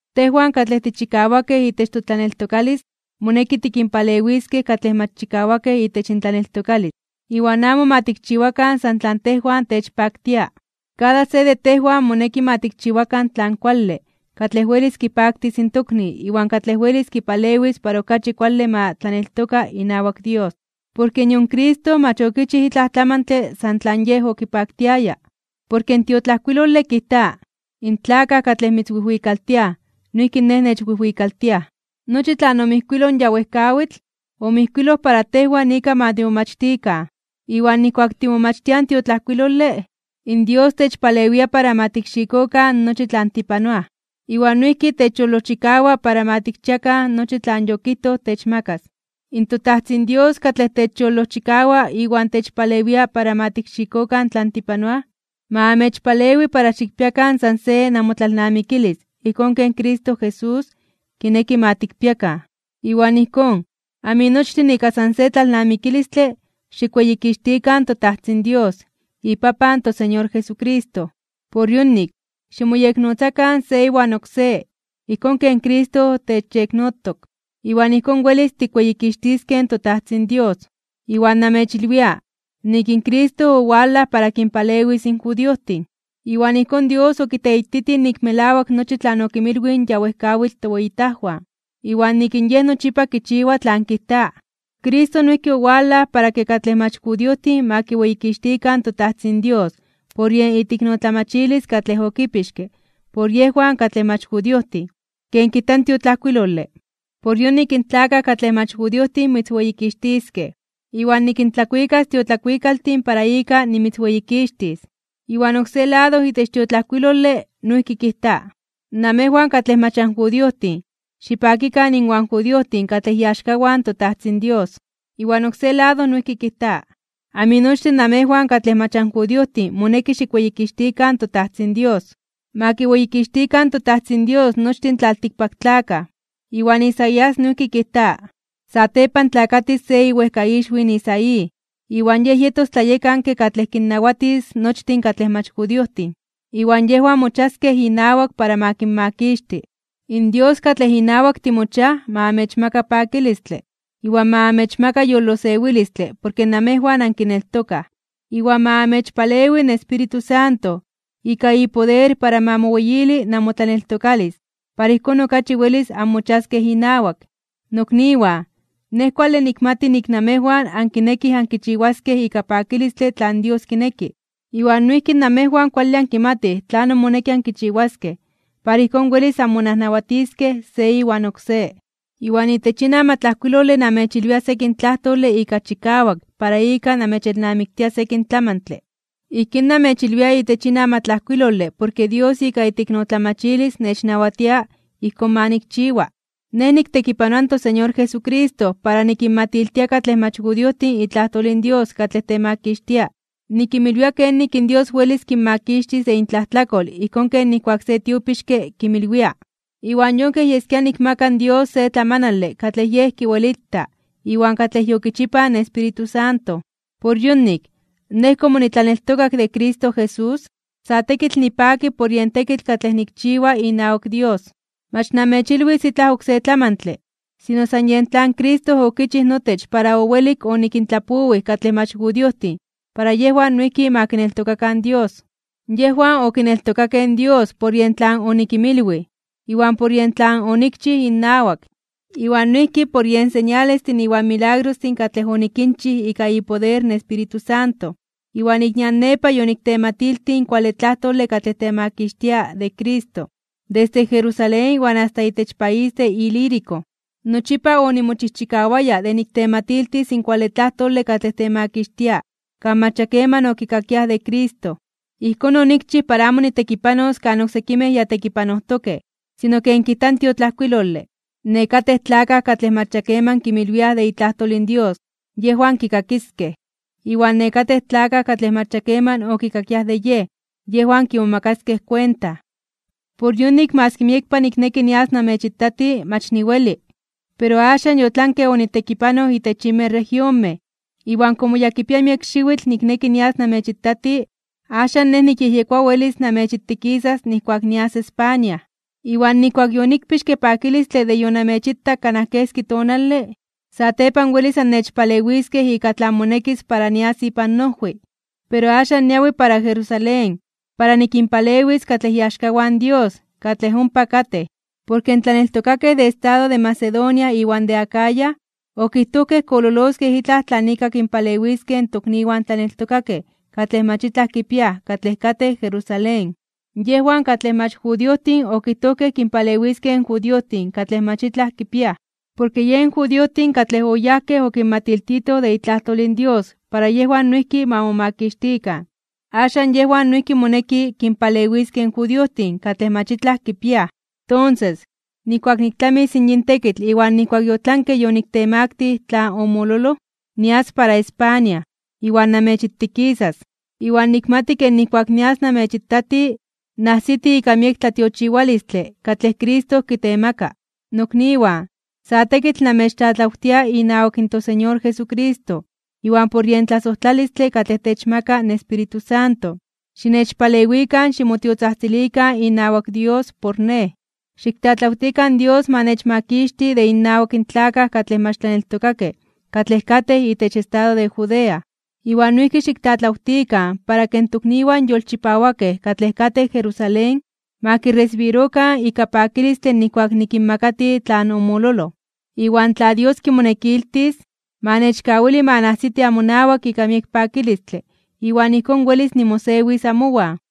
Tejwan katlej tichikawakej itech totlaneltokalis moneki tikinpalewiskej katlej mach chikawakej itech intlaneltokalis, iwan amo ma tikchiwakan san tlan tejwan techpaktia. Kada se de tejwan moneki ma tikchiwakan tlan kuale katlej welis kipaktis in tokni iwan katlej welis kipalewis para okachi kuale ma tlaneltoka inawak Dios. Porke nion Cristo mach okichij itlaj tlamantle san tlan Yej okipaktiaya. Porke in tiotlajkuilole kijta: “In tlakaj katlej mitzwijwikaltiaj noijki Nej nechwijwikaltiaj.” Nochi tlan omijkuiloj ya wejkawitl, omijkuiloj para tejwan ika ma timomachtikan. Iwan nijkuak timomachtiaj in tiotlajkuilole, in Dios techpalewia para ma tikxikokan nochi tlan tipanoaj. Iwan noijki techyolojchikawa para ma tikchiakan nochi tlan yokijtoj techmakas. ToTajtzin Dios katlej techyolojchikawa iwan techpalewia para ma tikxikokan tlan tipanoaj, ma amechpalewi para xikpiakan san se namotlalnamikilis ijkón ken Cristo Jesús kineki ma tikpiakan. Iwan ijkón, aminochtin ika san se tlalnamikilistle xikweyikixtikan in toTajtzin Dios, iPapan in toSeñor Jesucristo. Por yonik, ximoyeknotzakan se iwan oksé, ijkón ken Cristo techyeknotok. Iwan ijkón welis tikweyikixtiskej in toTajtzin Dios. Iwan namechilwia, nik in Cristo owalaj para kinpalewis in judiojtin. Iwan ijkón Dios okiteititij nik melawak nochi tlan okinmilwij in ya wejkawitl toweyitajwan, iwan nik in Yej nochipa kichiwa tlan kijta. Cristo noijki owalaj para ke katlej mach judiojtin ma kiweyikixtikan toTajtzin Dios por yen iteiknotlamachilis katlej okipixke por yejwan katlej mach judiojtin, ken kijta in tiotlajkuilole: Por yonik in tlakaj katlej mach judiojtin mitzweyikixtiskej, iwan nikintlakuikas tiotlakuikaltin para ika nimitzweyikixtis. Iwan oksé lado itech in tiotlajkuilole noijki kijta: Namejwan katlej mach anjudiojtin, xipakikan inwan judiojtin katlej iaxkawan in toTajtzin Dios. Iwan oksé lado noijki kijta: Aminochtin namejwan katlej mach anjudiojtin moneki xikweyikixtikan toTajtzin Dios. Ma kiweyikixtikan toTajtzin Dios nochtin tlaltikpaktlakaj. Iwan Isaías noijki kijta: Satepan tlakatis se iwejkaixwi in Isaí, iwan yej yetos tlayekanke katlej kinnawatis nochtin katlej mach judiojtin. Iwan yejwan mochiaskej inawak para ma kinmakixti. In Dios katlej inawak timochiaj ma amechmaka pakilistle, iwan ma amechmaka yolosewilistle porke namejwan ankineltokaj. Iwan ma amechpalewi in Espíritu Santo ika ipoder para ma moweyili namotlaneltokalis para ijkón okachi welis anmochiaskej inawak. Nokniwan, nej kuale nikmati nik namejwan ankinekij ankichiwaskej ika pakilistle tlan Dios kineki, iwan noijki namejwan kuale ankimatij tlanon moneki ankichiwaskej para ijkón welis anmonajnawatiskej se iwan oksé. Iwan itech yin amatlajkuilole namechilwia sekin tlajtole ika chikawak para ika namechelnamiktia sekin tlamantle. Ijkín namechilwia itech yin amatlajkuilole porke Dios ika iteiknotlamachilis nechnawatia ijkón ma nikchiwa. Nej niktekipanoa in toSeñor Jesucristo para nikinmatiltia katlej mach judiojtin itlajtol in Dios katlej temakixtia. Nikinmilwia kenik in Dios welis kinmakixtis de intlajtlakol ijkón ken nijkuak se tiopixke kinmilwia. Iwan yon kej yeskia nikmaka in Dios se tlamanale katlej Yej kiwelita, iwan katlej yokichipaj in Espíritu Santo. Por yonik, nej komo nitlaneltokak de Cristo Jesús, sa tekitl nipaki por yen tekitl katlej nikchiwa inawak Dios. Mach namechilwis itlaj oksé tlamantle, sino san yen tlan Cristo okichij notech para owelik onikintlapowij katlej mach judiojtin para yejwan noijki ma kineltokakan in Dios. Yejwan okineltokakej Dios por yen tlan onikinmilwij, iwan por yen tlan onikchij innawak, iwan noijki por yen señalestin iwan milagrostin katlej onikinchij ika ipoder in Espíritu Santo. Iwan ik nian nepa yoniktematiltij in kuale tlajtole katlej temakixtia de Cristo, desde Jerusalén iwan asta itech país de Ilírico. Nochipa onimochijchikawaya de niktematiltis in kuale tlajtole katlej temakixtia kan mach ya keman okikakiaj de Cristo. Ijkón onikchij para amo nitekipanos kan oksekimej ya tekipanojtokej. Sino ken kijta in tiotlajkuilole: Nekatej tlakaj katlej mach ya keman kinmilwiaj de itlajtol in Dios, yejwan kikakiskej. Iwan nekatej tlakaj katlej mach keman okikakiaj de Yej, yejwan kimomakaskej kuenta. Por yonik maski miekpa nikneki nias namechitati, mach niweli. Pero axan yotlanke onitekipanoj itech yinmej regionmej, iwan komo ya kipia miek xiwitl nikneki nias namechitati, axan nej nikyejyekoa welis namechitikisas nijkuak nias España. Iwan nijkuak yonikpixke pakilistle de yonamechitak kanaj keski tonale, satepan welis annechpalewiskej ika tlan monekis para nias ipan noojwi. Pero axan niawi para Jerusalén para nikinpalewis katlej iaxkawan Dios katlej ompa katej. Porke in tlaneltokakej de estado de Macedonia iwan de Acaya, okijtojkej kololoskej itlaj tlan ika kinpalewiskej in tokniwan tlaneltokakej katlej mach itlaj kipiaj katlej katej Jerusalén. Yejwan, katlej mach judiojtin okijtojkej kinpalewiskej in judiojtin katlej mach itlaj kipiaj. Porke yen judiojtin katlej oyajkej okinmatiltitoj de itlajtol in Dios para yejwan noijki ma momakixtikan. Axan yejwan noijki moneki kinpalewiskej in judiojtin katlej mach itlaj kipiaj. Tonses, nijkuak niktlamis yin tekitl iwan nijkuak yotlanke yoniktemaktij (yoniktemaktilij) tlan omololoj, nias para España, iwan namechitikisas. Iwan nikmati ke nijkuak nias namechitati, najsiti ika miek tlatiochiwalistle katlej Cristo kitemaka. Nokniwan, sa tekitl namechtlatlawtia inawak toSeñor Jesucristo iwan por yen tlasojtlalistle katlej techmaka in Espíritu Santo, xinechpalewikan ximotiotzajtzilikan inawak Dios por nej. Xiktlatlawtikan Dios ma nechmakixti de innawak in tlakaj katlej mach tlaneltokakej katlej katej itech estado de Judea. Iwan noijki xiktlatlawtikan para ke in tokniwan yolchipawakej katlej katej Jerusalén ma kiresibirokan ika pakilistle nijkuak nikinmakati tlan omololoj. Iwan tla Dios kimonekiltis, ma nechkawili ma najsiti amonawak ika miek pakilistle iwan ijkón welis nimosewis amowan.